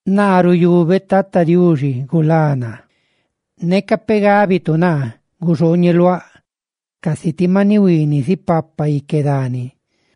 Naa ruyubeꞌ Tata Diuxi gulá naa. Neca peꞌ gábitu naa: «Guxooñeluaꞌ casi ti maniꞌ huiiniꞌ zipapa ique dani.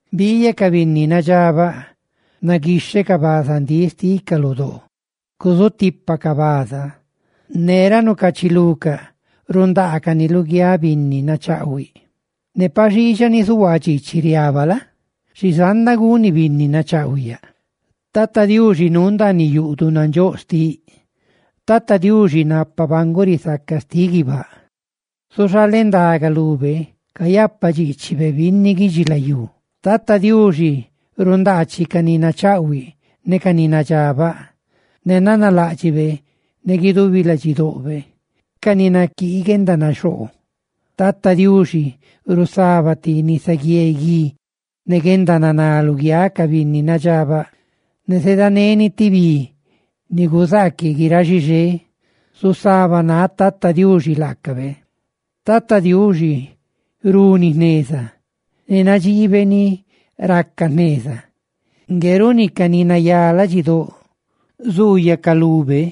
Biiyaꞌ ca binni nadxabaꞌ: naguixhecaꞌ bazandíꞌ xticaꞌ lu doo, cuzutipacaꞌ baza ne ra nucaachilucaꞌ rundaacani luguiáꞌ binni nachaꞌhuiꞌ. Ne pa xiixa ni zuhuaa dxiichiꞌ riaba la? xi zanda guni binni nachaꞌhuiꞌ yaꞌ.» Tata Diuxi nuu ndaaniꞌ yuꞌduꞌ nandxóꞌ xtiꞌ. Tata Diuxi, napa banguꞌ risaca xtiꞌ guibáꞌ, zuxaleꞌ ndaga lube cayapadxiichibe binni guidxilayú. Tata Diuxi rundaachiꞌ ca ni nachaꞌhuiꞌ ne ca ni nadxabaꞌ, ne nanaláꞌdxibe ne guidubi ladxidoꞌbe, ca ni naquii guendanaxoo. Tata Diuxi zusaba ti nisaguié guí ne guendananá luguiáꞌ ca binni nadxabaꞌ, ne zedaneni ti bi ni guzaaquiꞌ guiráꞌ xixé. ¡Zusabanáꞌ Tata Diuxi laacabe! Tata Diuxi runi jneza ne nadxiibe ni raca jneza; ¡ngue runi ca ni nayá ladxidóꞌ zuuyacaꞌ lube!